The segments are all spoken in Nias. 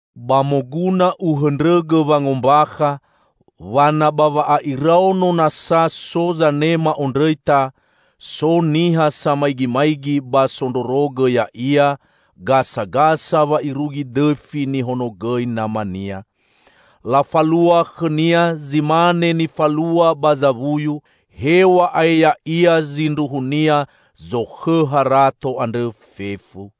Ba moguna uhõndrõgõ wangombakha wa na ba wa'a'iraono nasa so zanema ondrõita, so niha samaigimaigi ba sondrorogõ ya'ia gasagasa wa irugi dõfi nihonogõi namania. Lafalua khõnia zi mane nifalua ba zawuyu, hew̃a'ae ya'ia zindruhunia zokhõ harato andrõ fefu.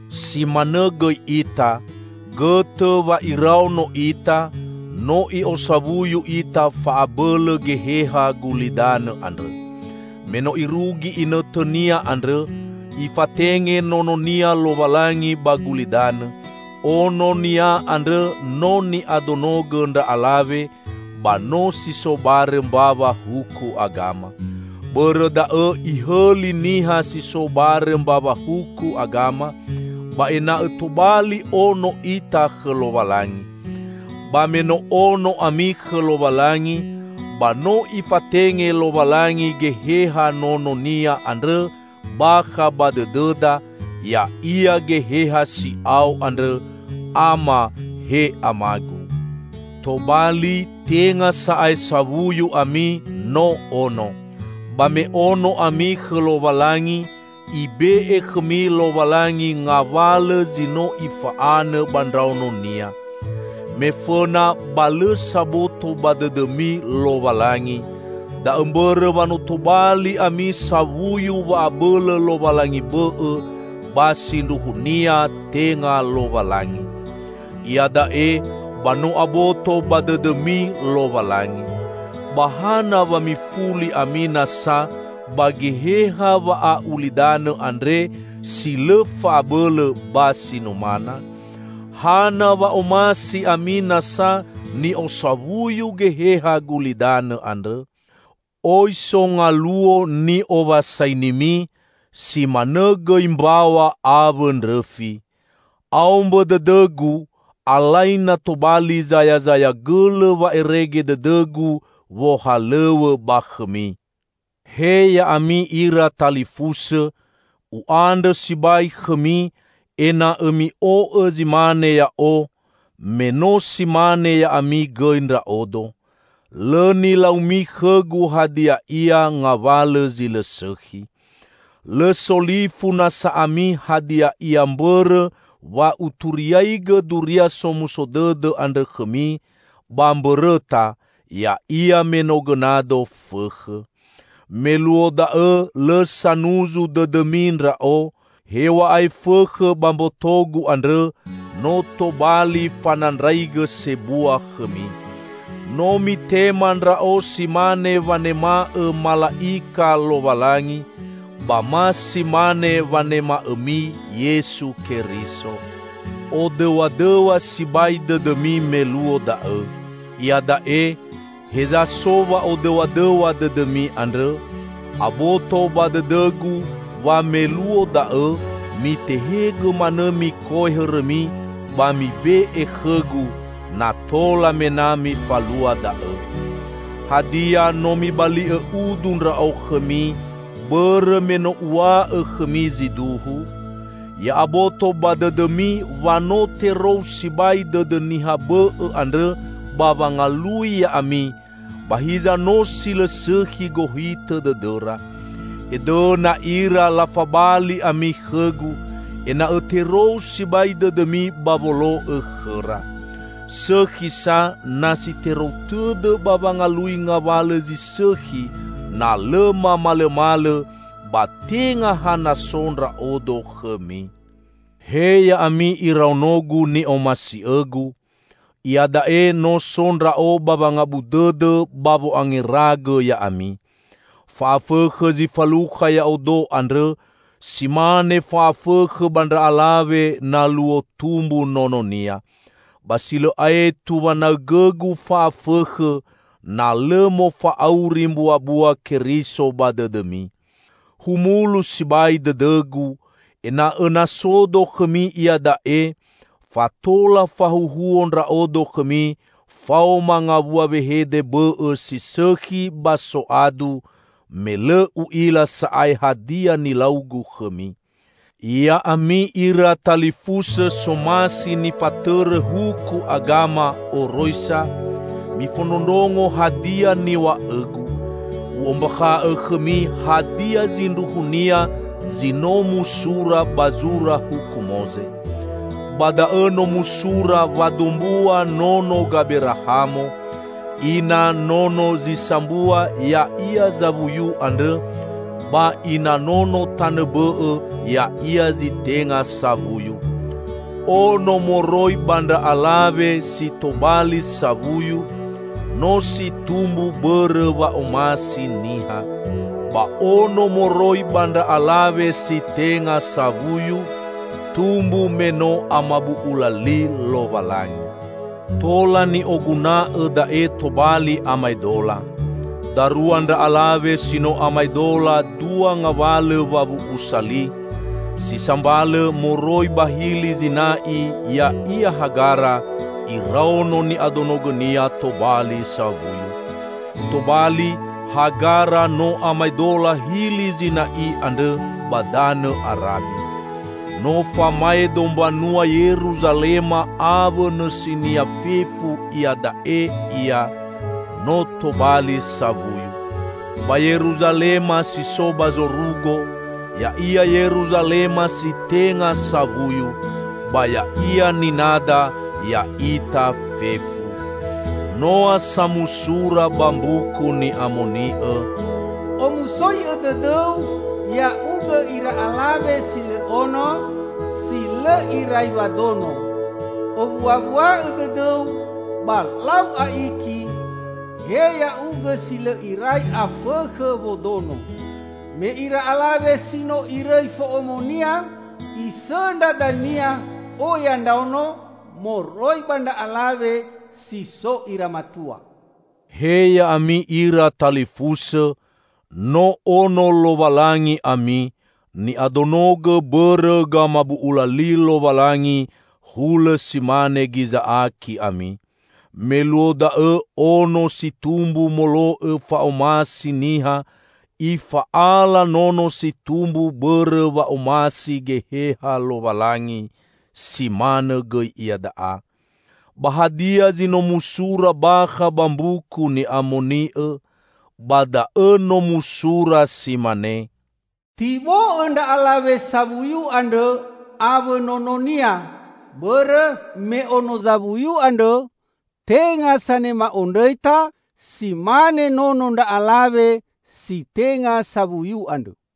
Si manõ gõi ita: Gõtõ wa iraono ita, no i'osawuyu ita fa'abõlõ geheha gulidanõ andrõ. Me no irugi inõtõnia andrõ, Ifatenge Nononia Lowalangi ba gulidanõ. Ono-Nia andrõ no ni'adonogõ ndra alawe ba no si so barõ mbawa huku agama. Bõrõ da'õ ihõli niha si so barõ mbawa huku agama; ba ena'õ tobali ono ita khõ Lowalangi. Ba me no ono ami khõ Lowalangi, ba no Ifatenge Lowalangi Geheha Nono-Nia andrõ bakha ba dõdõda, ya'ia Geheha si'ao andrõ, "Ama, he Amagu." Tobali, tenga sa'ae sawuyu ami, no ono. Ba me ono ami khõ Lowalangi, Ibe'e khõmi Lowalangi ngawalõ zi no Ifa'anõ ba ndraono-Nia. Me fõna ba lõ saboto ba dõdõmi Lowalangi, da'õ mbõrõ wa no tobali ami sawuyu wa'abõlõ lowalangi bõ'õ, ba sindruhunia tenga Lowalangi. Iada'e, ba no aboto ba dõdõmi Lowalangi. Ba hana wa mifuli ami nasa ba geheha wa'a'ulidanõ andre, si lõ fa'abõlõ ba si numana? Hana wa omasi ami nasa ni'osawuyu geheha gulidanõ andrõ? Oi so ngaluo ni'owasainimi, si manõ gõi mbaw̃a awõ ndrõfi. Aombõ dõdõgu, alai na tobali zayazaya gõlõ wa'erege dõdõgu wohalõw̃õ ba khõmi! He ya'ami ira talifusõ! U'andrõ sibai khõmi, ena'õ mi'o'õ zi mane ya'o, me no si mane ya'ami gõi ndra'odo. Lõ nilaumi khõgu hadia ia ngawalõ zi lõ sõkhi. Lõ solifu nasa ami hadia ia mbõrõ wa uturiagõ Duria Somuso Dõdõ andrõ khõmi, ba mbõrõta, ya'ia me no gõnado fõkhõ. Me luo da'õ lõ sanuzu dõdõmi ndra'o, hew̃a'ae fõkhõ ba mbotogu andrõ no tobali fanandraigõ sebua khõmi. No mitema ndra'o si mane wanema'õ mala'ika Lowalangi, ba ma si mane wanema'õmi Yesu Keriso. Odõw̃adõw̃a sibai dõdõmi me luo da'õ. Iada'e, heza so wa'odõw̃adõw̃a dõdõmi andrõ? Aboto ba dõdõgu wa meluo da'õ mitehegõ manõ mikoe hõrõmi ba mibe'e khõgu, na tola mena mifalua da'õ. Hadia, no mibali'õ udu ndra'o khõmi, bõrõ me no uw̃a'õ khõmi zi duhu? Ya'aboto ba dõdõmi wa no terou sibai dõdõ niha bõ'õ andrõ ba wangalui ya'ami, ba hiza no si lõ sõkhi gohitõ dõdõra. Edõna ira lafabali ami khõgu, ena'õ terou sibai dõdõmi ba wolo'õ khõra. Sõkhi sa na si terou tõdõ ba wangalui ngawalõ zi sõkhi, na lõ mamalõmalõ, ba tenga ha na so ndra'odo khõmi. He ya'ami iraonogu ni'omasi'õgu! Iada'e, no so ndra'o ba wangabu dõdõ ba wo'angeragõ ya'ami. Fa'afõkhõ zi falukha ya'odo andrõ, si mane fa'afõkhõ ba ndra alawe na luo tumbu nononia. Ba si lõ aetu wanaõgõgu fa'afõkhõ, na lõ mofa'auri mbuabua Keriso ba dõdõmi. Humulu sibai dõdõgu, ena'õ na sodo khõmi iada'e, fa tola fahuhuo ndra'odo khõmi faoma ngawua wehede bõ'õ si sõkhi ba soadu, me lõ u'ila sa'ae hadia nilaugu khõmi. Ya'ami ira talifusõ somasi nifatõrõ huku agama (oroisa), mifondrondrongo hadia niw̃a'õgu! U'ombakha'õ khõmi hadia zindruhunia zi no musura ba zura Huku Moze. Ba da'õ no musura wa dombua nono Gaberahamo: Ina nono zi sambua ya'ia zawuyu andrõ, ba ina nono tanõ bõ'õ ya'ia zi tenga sawuyu. Ono moroi ba ndra alawe si tobali sawuyu, no si tumbu bõrõ wa'omasi niha. Ba ono, moroi ba ndra alawe si tenga sawuyu, tumbu me no amabu'ula li Lowalangi. Tola ni'oguna'õ da'e tobali amaedola. Darua ndra alawe si no amaedola dua ngawalõ wawu'usa li: si sambalõ, moroi ba Hili Zina'i -- ya'ia Hagara; iraono ni'adonogõnia tobali sawuyu. Tobali, Hagara no amaedola Hili Zina'i andrõ, ba danõ Arabi. No famaedo mbanua Yeruzalema awõ nõsinia fefu iada'e ia, no tobali sawuyu. Ba Yeruzalema si so ba zorugo, ya'ia Yeruzalema si tenga sawuyu, ba ya'ia ninada, ya'ita fefu. Noa sa musura ba Mbuku Ni'amoni'õ, "Omusoi'õ dõdõu ya'ugõ ira alawe si lõ ono, si lõ irai wadono! Owuawua'õ dõdõu ba lau a'iki, he ya'ugõ si lõ irai afõkhõ wodono! Me ira alawe si no irõi fo'omonia isõndra dania oya ndraono moroi ba ndra alawe si so ira matua." He ya'ami ira talifusõ! No ono Lowalangi ami, ni'adonogõ bõrõ gamabu'ula li Lowalangi; hulõ si mane Giza'aki ami. Me luo da'õ ono si tumbu molo'õ fa'omasi niha, ifa'ala nono si tumbu bõrõ wa'omasi Geheha Lowalangi, si manõ gõi iada'a. Ba hadia zi no musura bakha ba Mbuku Ni'amoni'õ? Ba da'õ no musura si mane: "Tibo'õ ndra alawe sawuyu andrõ awõ nononia, bõrõ me ono zawuyu andrõ tenga sanema ondrõita, si mane nono ndra alawe si tenga sawuyu andrõ."